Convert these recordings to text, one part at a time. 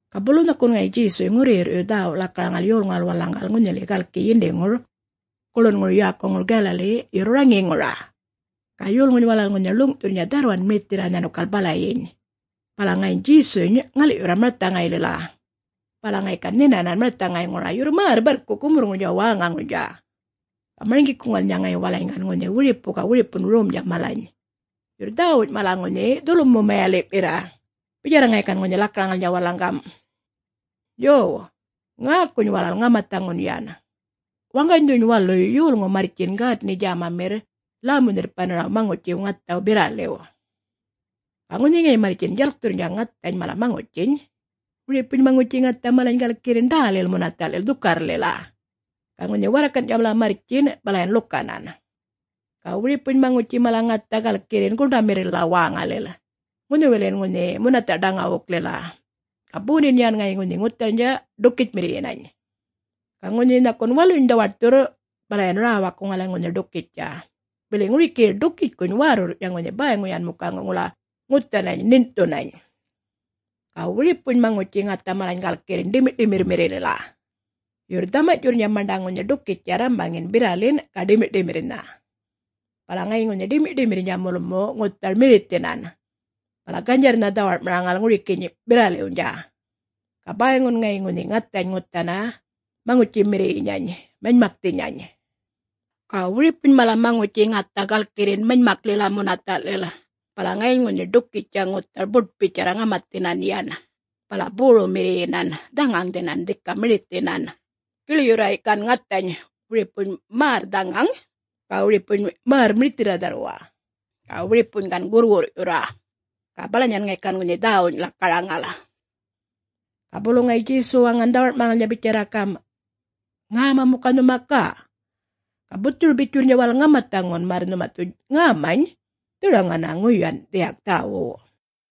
Ga bulu nhakun ŋayi Djesuy ŋurruyirr'yurr dhäwu lakaraŋal, yolŋuwal walalaŋgal ŋunhili galki yindiŋur guḻunŋur yäkuŋur Galali, yurr raŋiŋura. Ga yolŋuny walal ŋunhi ḻuŋ'thurrnydja dharrwan mirithirra nhanukal balayiny. Bala ŋayiny Djesuny ŋal'yurra marthaŋaylila. Bala ŋayi gan nhinanan marthaŋayŋura, yurr märr barrku gumurrŋurnydja wäŋaŋurnydja. Ga marŋgikuŋalnydja ŋayi walalany gan ŋunhi wiripu ga wiripun romdja malany, yurr dhäwuny mala ŋunhi dhulmu-mayali'mirra, bitjarra ŋayi gan ŋunhi lakaraŋalnydja walalaŋ gam', “Yo. Ŋäkuny walal ŋamathaŋun yan: Waŋganydhuny waluy yolŋu marrtjin gätni-djämamirr lämu-nhirrpanaraw maŋutjiw ŋathaw birraliw. Ga ŋunhi ŋayi marrtjin djalkthurrnydja ŋathany mala maŋutjiny, wiripuny maŋutji ŋatha malany galkirrin ḏällila munatha'lil dhukarrlila, ga ŋunhi warrakan'tja mala marrtjin, bala yan ḻukanan. Ga wiripuny maŋutji mala ŋatha galkirrin guṉḏamirrilila wäŋalil, ŋunhiwilin ŋunhi munatha' ḏaŋawuklila. Ga bondin yan ŋayi ŋunhi ŋutharnydja ḏukitjmirriyinany. Ga ŋunhi nhakun waluny dhawaṯthurr bala yan räwakkuŋala ŋunhi ḏukitjtja, bili ŋuriki ḏukitjkuny wärrurrny'tja ŋunhi bäyŋu yan muka ŋula ŋuthanany ṉiṉ'thunany. Ga wiripuny maŋutji ŋatha malany galkirrin ḏimiṯimirrmirrilila, yurr dhamany'tjurrnydja maṉḏa ŋunhi ḏukitjtja rrambaŋin birralin ga ḏimiṯimirrnha. Bala ŋayiny ŋunhi ḏimiṯimirrmirrnydja mulmu ŋuthar mirithinan, bala ganydjarrnha dhawar'maraŋal ŋurikiyiny birraliwnydja, ga bäyŋun ŋayi ŋunhi ŋathany ŋuthana maŋutjimirriyinyany manymakthinyany. Ga wiripuny mala maŋutji ŋatha galkirrin manymaklila munatha'lil, bala ŋayiny ŋunhi ḏukitjtja ŋuthar buṯ bitjarra ŋamathinan yan, bala borummirriyinan dhaŋaŋdhinan dhika mirithinan, giḻyurra gan ŋathany, wiripuny märr dhaŋaŋ, ga wiripuny märr mirithirra dharrwa, ga wiripuny gan gurrwurr'yurra.” Ga balanyan ŋayi gan ŋunhi dhäwuny lakaraŋal. Ga bulu ŋayi Djesu waŋan dhawar'maraŋalnydja bitjarra gam', “Ŋäma muka nhuma ga? Ga buthuru-bitjurrnydja walal ŋamathaŋun, märr nhuma dhu ŋämany dharaŋana ŋuyan dhiyak dhäwuw.”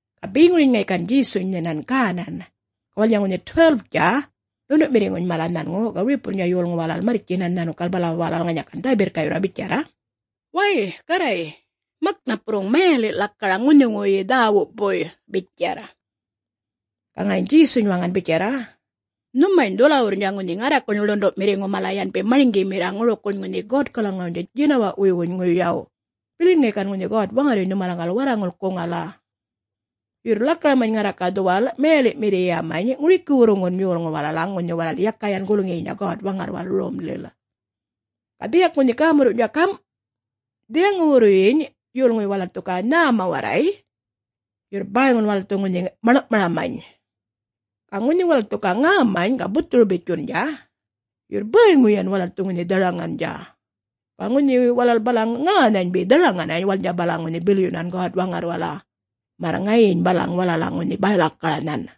Ga beŋuryiny ŋayi gan Djesuny nhinan gänan, ga walalnydja ŋunhi 12-dja ḻundu'mirriŋuny mala nhanŋu ga wiripuwurrnydja yolŋu walal marrtjinan nhanukal bala walal ŋanya dhä-birrka'yurra bitjarra, “Way! Garray, mak napurruŋ mayali' lakaraŋ ŋunhiŋuwuyyi dhäwupuy,” bitjarr. Ga ŋayiny Djesuny waŋan bitjarra, “Nhumany dhuwalawurrnydja ŋunhi ŋarrakuny ḻundu'mirriŋu mala yanbi marŋgimirra ŋurukuny ŋunhi Godkalaŋawnydja djinawa'wuywuny ŋuyaw, bilin ŋayi gan ŋunhi God-Waŋarryuny nhumalaŋgal warralkuŋala. Yurr lakaramany ŋarra ga dhuwal mayali'mirriyamany ŋurikiwurruŋgun yolŋuw walalaŋ, ŋunhi walal yaka yan gulŋiyinya God-Waŋarrwal Romlil.” Ga dhiyak ŋunhi gämurruwny'tja gam. “Dhiyaŋuwurruyyiny yolŋuy walal dhu ga nhäma warray, yurr bäyŋun walal dhu ŋunhi maḻŋ'maramany. Ga ŋunhi walal dhu ga ŋämany ga buthuru-bitjundja, yurr bäyŋuyi yan walal dhu ŋunhi dharaŋandja. Ga ŋunhi walal balaŋ ŋänhany be dharaŋanany, walalnydja balaŋ ŋunhi bilyunan God-Waŋarrwala, märr ŋayiny balaŋ walalaŋ ŋunhi bäy-lakaranhan.”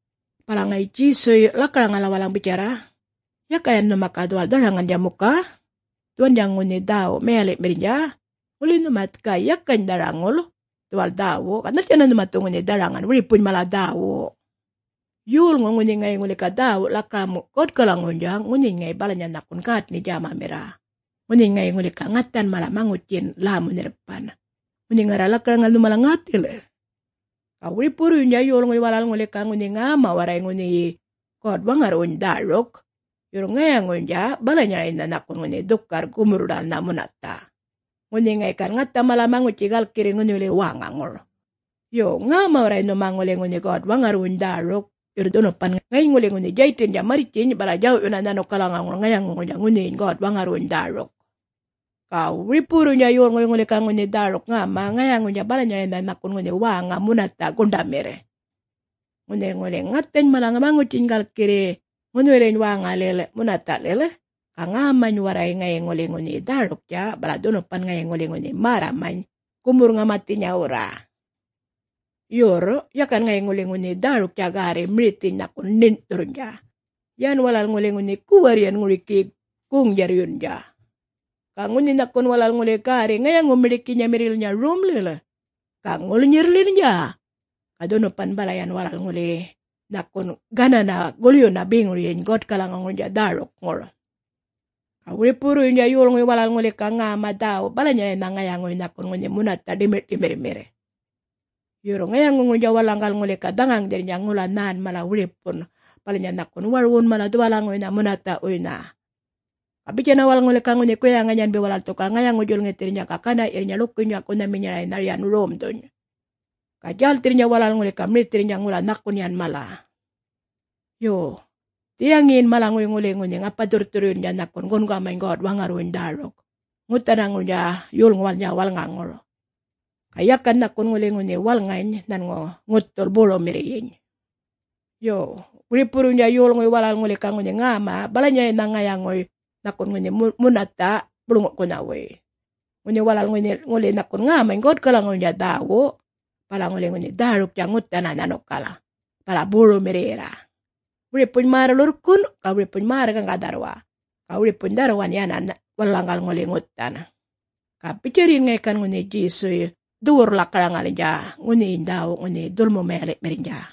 Bala ŋayi Djesuy lakaraŋala walalaŋ bitjarra, “Yaka yan nhuma ga dhuwal dharaŋandja muka? Dhuwandja ŋunhi dhäwu mayali'mirrnydja? Ŋuli nhuma ga yakany dharaŋul dhuwal dhäwu, ga nhaltjanna nhuma dhu ŋunhi dharaŋan wiripuny mala dhäwu. Yolŋu ŋunhi ŋayi ŋuli ga dhäwu lakaram Godkalaŋuwuynydja, ŋunhiyiny ŋayi balanya nhakun gätni-djämamirra, ŋunhiny ŋayi ŋuli ga ŋathan mala maŋutjin lämu-nhirrpan, ŋunhi ŋarra lakaraŋal nhumalaŋ ŋäthil. Ga wiripuwurruynydja yolŋuy walal ŋuli ga ŋunhi ŋäma warray ŋunhiyi God-Waŋarrwuny Dhäruk, yurr ŋayaŋuynydja balanyaraynha nhakun ŋunhi dhukarr gumurr-ḏäl munatha', ŋunhi ŋayi gan ŋatha mala maŋutji galkirrin ŋunhiliyi wäŋaŋur. Yo. Ŋäma warray nhuma ŋuli ŋunhi God-Waŋarrwuny dhäruk, yurr dhunupan ŋayiny ŋuli ŋunhi Djaytindja marrtjiny bala djaw'yunna nhanukalaŋuŋur ŋayaŋuŋurnydja ŋunhiyiny God-Waŋarrwuny dhäruk. Ga wiripuwurruynydja yolŋuy ŋuli ga ŋunhi dhäruk ŋäma, ŋayaŋuynydja balanyaraynha nhakun ŋunhi wäŋa munatha' guṉḏamirr, ŋunhi ŋuli ŋathany mala maŋutjiny galkirri ŋunhiwiliyiny wäŋalil munatha'lil, ga ŋäma warray ŋayi ŋuli ŋunhiyi dhäruktja, bala dhunupan ŋayi ŋuli ŋunhi märramany gumurr-ŋamathinyawurra. Yurr yakan ŋayi ŋuli ŋunhi dhäruktja gärri mirithiny nhakun ṉiṉ'thurrnydja; yan walal ŋuli ŋunhi guwarr yan ŋurikiyi goŋ-djarryundja. Ga ŋunhi nhakun walal ŋuli gärri ŋayaŋu-miḏikinyamirrililnydja romlil ga ŋulnyirrlilnydja, ga dhunupan bala yan walal ŋuli nhakun gananna, gulyunna beŋuryiny Godkalaŋuŋurnydja dhärukŋur.” “Ga wiripuwurruynydja yolŋuy walal ŋuli ga ŋäma dhäwu balanyaraynha ŋayaŋuy nhakun ŋunhi munatha' ḏimiṯimirrmirr. Yurr ŋayaŋuŋurnydja walalaŋgal ŋuli ŋunhi dhaŋaŋdhirrnydja ŋula nhän mala wiripun; balanya nhakun warwun mala dhuwalaŋuwuynha munatha'wuynha. Ga bitjanna walal ŋuli ga ŋunhi guyaŋany yanbi walal dhu ga ŋayaŋu-djulŋithirrnydja ga gana'yirrnydja ḻukunydja'kunhaminyaraynha yan romdhuny. Ga djälthirrnydja walal ŋuli ga mirithirrnydja ŋula nhakun yan mala. Yo, dhiyaŋiyin malaŋuy ŋuli ŋunhi ŋapa-dhurrthurryundja, nhakun gungamany God-Waŋarrwuny dhäruk ŋuthanaŋurnydja yolŋuwalnydja walŋaŋur, ga yakan nhakun ŋuli ŋunhi walŋany nhanŋu ŋuthul borummirriyiny. Ga wiripuwurruynydja yolŋuy walal ŋuli ga ŋunhi ŋäma dhäwu balanyaraynha ŋayaŋuy nhakun ŋunhi munatha' buḻŋu'kunhawuy. Ŋunhi walal ŋuli nhakun ŋämany Godkalaŋuwuynydja dhäwu, bala ŋuli ŋunhi dhäruktja ŋuthanna nhanukal, bala borummirriyirra; wiripuny märr ḻurrkun', ga wiripuny märr gaŋga dharrwa, ga wiripuny dharrwan yänan walalaŋgal ŋuli ŋuthan.” Ga bitjarryin ŋayi gan ŋunhi Djesuy dhuwurr-lakaraŋalnydja ŋunhiyiny dhäwu ŋunhi dhulmu-mayali'mirrnydja.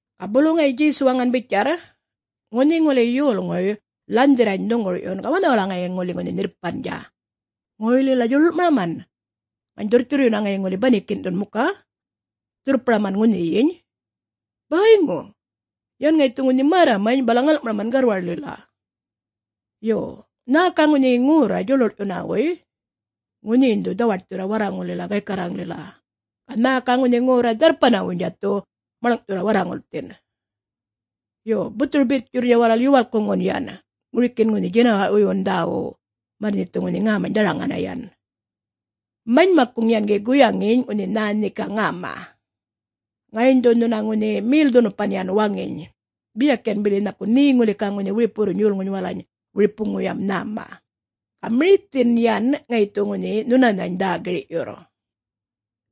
Ga bulu ŋayi Djesu waŋan bitjarr, “Ŋunhi ŋuli yolŋuy lanhdhirrany dhuŋgur'yun, ga wanhawala ŋayi ŋuli ŋunhi nhirrpandja? … ŋoylila djuḻuḻ'maram? … ŋany dhurrthurryunna ŋayi ŋuli banikin'thun muka? … dhurrparaman ŋunhiyiny? Bäyŋu. Yan ŋayi dhu ŋunhi märramany, bala ŋal'maraman garrwarlila. Yo, nhä ga ŋunhi ŋorra djuḻuḻ'maranhawuy, ŋunhiyiny dhu dhawaṯthurra warraŋullila gaykarraŋlila, ga nhä ga ŋunhi ŋorra dharrpanawuynydja dhu maḻŋ'thurra warraŋulthin.” “Yo, buthuru-bitjurrnydja walal yuwalkkuŋun yan ŋurikin ŋunhi djinawa'wuywun dhäwuw, märr nhe dhu ŋunhi ŋämany dharaŋana yan.” “Manymakkuŋ yan gi guyaŋiny ŋunhi nhä nhe ga ŋäma. Ŋayiny dhu nhuna ŋunhi mel-dhunupan yan waŋiny, biyak yan bili nhakun nhe ŋuli ga ŋunhi wiripuwurruny yolŋuny walalany wiripuŋuyam nhäma. Ga mirithin yan ŋayi dhu ŋunhi nhunanhany dhä-gir'yurr.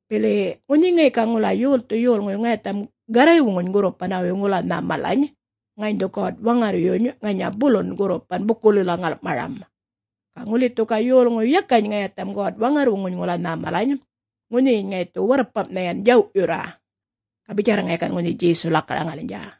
Bili ŋunhi ŋayi ga ŋula yolthu yolŋuy ŋayatham Garraywuŋuny gurrupanawuy ŋula nhä malany, ŋayiny dhu God-Waŋarryuny ŋanya bulun gurrupan bukulila ŋal'maram. Ga ŋuli dhu ga yolŋuy yakany ŋayatham God-Waŋarrwuŋuny ŋula nhä malany, ŋunhiyiny ŋayi dhu warrpam'nha yan djaw'yurr.” Ga bitjarra ŋayi gan ŋunhi Djesuy lakaraŋalnydja.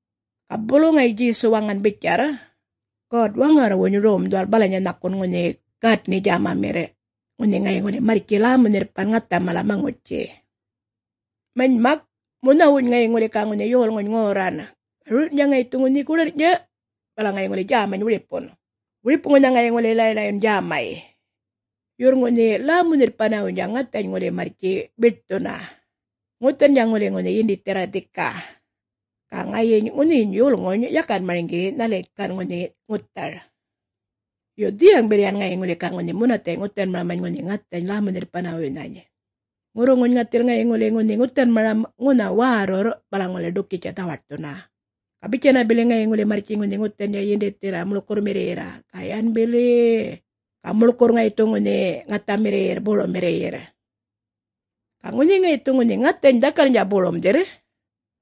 Ga bulu ŋayi Djesu waŋan bitjarr, “God-Waŋarrwuny Rom dhuwal balanya nhakun ŋunhi gätni-djämamirr, ŋunhi ŋayi ŋuli marrtji lämu-nhirrpan ŋatha mala maŋutji. Manymak munhawuny ŋayi ŋuli ga ŋunhi yolŋuny ŋorran, ga rur'yundja ŋayi dhu ŋunhi goḏarrny'tja bala ŋayi ŋuli djämany wiripun, wiripuŋuynha ŋayi ŋuli ḻay-ḻayyun djämay. Yurr ŋunhi lämu-nhirrpanawuynydja ŋathany ŋuli marrtji biṯthunna, ŋuthandja ŋuli ŋunhi yindithirra dhika, ga ŋayiny ŋunhiyiny yolŋuny yakan marŋgi nhaliy ŋayi gan ŋunhi ŋuthar. Yo, dhiyaŋ bili yan ŋayi ŋuli ga ŋunhi munathay' ŋuthanmaramany ŋunhi ŋathany lämu-nhirrpanawuynhany. Ŋurruŋuny ŋathil ŋayi ŋuli ŋunhi ŋuthanmaram ŋunha wärrurr, bala ŋuli ḏukitjtja dhawaṯthunna, ga bitjanna bili ŋayi ŋuli marrtji ŋunhi ŋuthandja yindithirra muḻkurrmirryirra, ga yan bili-i-i-i ga muḻkurr ŋayi dhu ŋunhi ŋathamirriyirr borummirryirr. Ga ŋunhi ŋayi dhu ŋunhi ŋathany dhakalnydja borumdhirr,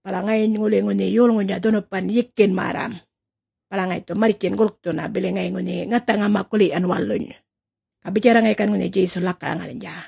bala ŋayiny ŋuli ŋunhi yolŋuynydja dhunupan yikin märram, bala ŋayi dhu marrtji gulkthunna, bili ŋayi ŋunhi ŋatha-ŋamakuli'yan waluny.” Ga bitjarra ŋayi gan ŋunhi Djesuy lakaraŋalnydja.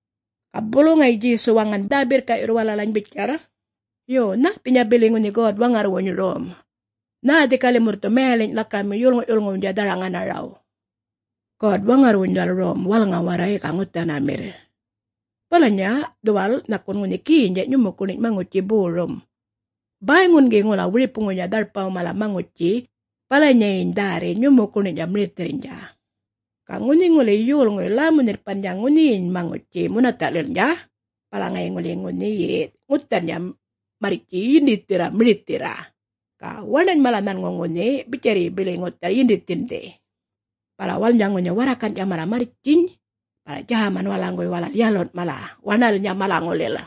Ga bulu ŋayi Djesu waŋan dhä-birrka'yurr walalany bitjarr, “Yo, nhäthinya bili ŋunhi God-Waŋarrwuny Rom? Nhä dhika limurr dhu mayaliny' lakaram yolŋu'-yulŋuwnydja dharaŋanaraw? God-Waŋarrwuny dhuwal Rom walŋa warray ga ŋuthanamirr, balanya dhuwal nhakun ŋunhi genydja' nyumukuṉiny maŋutji borum. Bäyŋun gi ŋula wiripuŋuwnydja dharpaw mala maŋutji balanyayiny dhärri nyumukuṉiny'tja mirithirrnydja. Ga ŋunhi ŋuli yolŋuy lämu-nhirrpandja ŋunhiyiny maŋutji munatha'lilnydja, bala ŋayi ŋuli ŋunhiyi ŋuthandja marrtji yindithirra mirithirra, ga waṉany mala nhanŋu ŋunhi bitjarryi bili yan ŋuthar yindithindhi. Bala walalnydja ŋuli warrakan'tja mala marrtjiny bala djäman walalaŋguwuy walal yalun' mala waṉa'lilnydja malaŋulil.”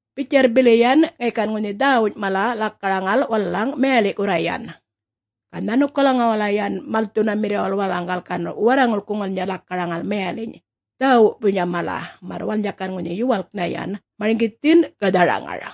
Bitjarr bili yan ŋayi gan ŋunhi dhäwuny mala walalaŋ lakaraŋal mayali'kurra yan. Ga nhanukalaŋuwala yan malthunamirriwal walalaŋgal ŋayi gan warraŋulkuŋalnydja lakaraŋal mayaliny' dhäwupuynydja mala, märr walalnydja gan ŋunhi yuwalknha yan marŋgithin ga dharaŋar.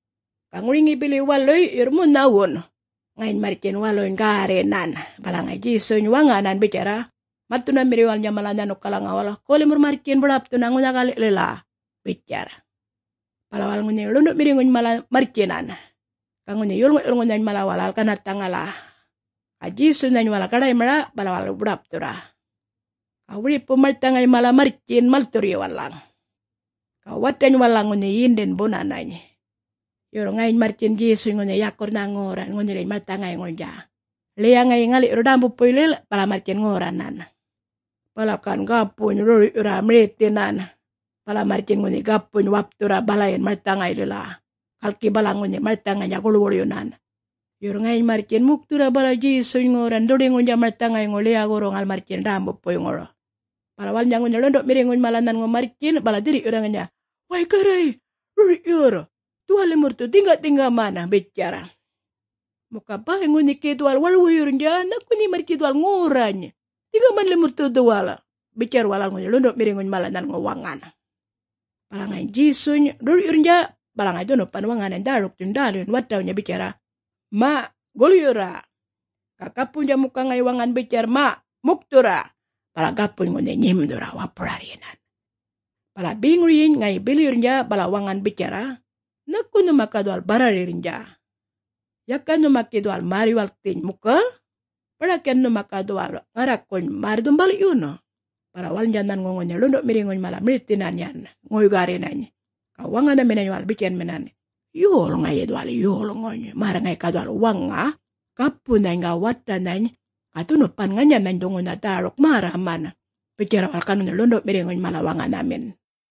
Ga ŋuriŋiyi bili waluy yurr munhawun, ŋayiny marrtjin waluny gärrinan, bala ŋayi Djesuny waŋanan bitjarra malthunamirriwalnydja mala nhanukalaŋuwal, “Go limurr marrtjin, buḏapthunna ŋunha-gali'lila,” bitjarr. Bala walal ŋunhi ḻundu'mirriŋuny mala marrtjinan, ga ŋunhi yolŋu'-yulŋunhany mala walal ganarrthaŋala, ga Djesunhany walal gaḏaymara, bala walal buḏapthurra. Ga wiripu marthaŋay mala marrtjin malthurryi walalaŋ. Ga watany walalaŋ ŋunhi yindin bunanany, yurr ŋayiny marrtjin Djesuny ŋunhi yakurrnha ŋorran ŋunhiliyiny marthaŋayŋurnydja, ḻiya ŋayi ŋal'yurr ḏämbupuylil, bala marrtjin ŋorranan. Bala gan gapuny rur'yurra mirithinan, bala marrtjin ŋunhi gapuny wapthurra balayin marthaŋaylila, galki balaŋ ŋunhi marthaŋaynydja guḻwuḻyunan. Yurr ŋayiny marrtjin mukthurra bala Djesuny ŋorran dhuḏiŋurnydja marthaŋayŋur ḻiya-gorruŋal marrtjin ḏämbupuyŋur. Bala walalnydja ŋunhi ḻundu'mirriŋuny mala nhanŋu marrtjin, bala dhirr'yurra ŋanya, “Way, Garray. Rur'yurr! Dhuwal limurr dhu dhiŋga'-dhiŋgaman,” bitjarr. “Muka bäyŋu nhe gi dhuwal warwuyurrnydja. Nhaku nhe marrtji dhuwal ŋorrany? Dhiŋgaman limurr dhu dhuwal.” Bitjarr walal ŋunhi ḻundu'mirriŋuny mala nhanŋu waŋan. Bala ŋayi Djesuny rur'yurrnydja, bala dhunupan waŋanany dhärukthuny ḏälyun watawnydja bitjarra, “Ma', gulyurra!” ga gapuwnydja muka ŋayi waŋan bitjarr, “Way mukthurra,” bala gapuny ŋunhi nyimdhurra wapurarryinan. Bala beŋuryiny ŋayi bilyurrnydja, bala waŋan bitjarra, “Nhaku nhuma ga dhuwal barrarirrnydja? Yaka nhuma gi dhuwal märr-yuwalkthiny muka? Baḏak yan nhuma dhu ga dhuwal ŋarrakuny märr-dhumbal'yun?” Bala walalnydja nhanŋu ŋunhi ḻundu'mirriŋuny mala mirithinan yan ŋoy-gärrinany, ga waŋanhaminany walal bitjanminan, “Yol ŋayi dhuwal yolŋuny? … märr ŋayi ga dhuwal waŋa gapunhany ga watanhany, ga dhunupan ŋanyanhany dhu ŋunhi dhäruk märraman.” Bitjarra walal gan ŋunhi ḻundu'mirriŋuny mala waŋanhamin.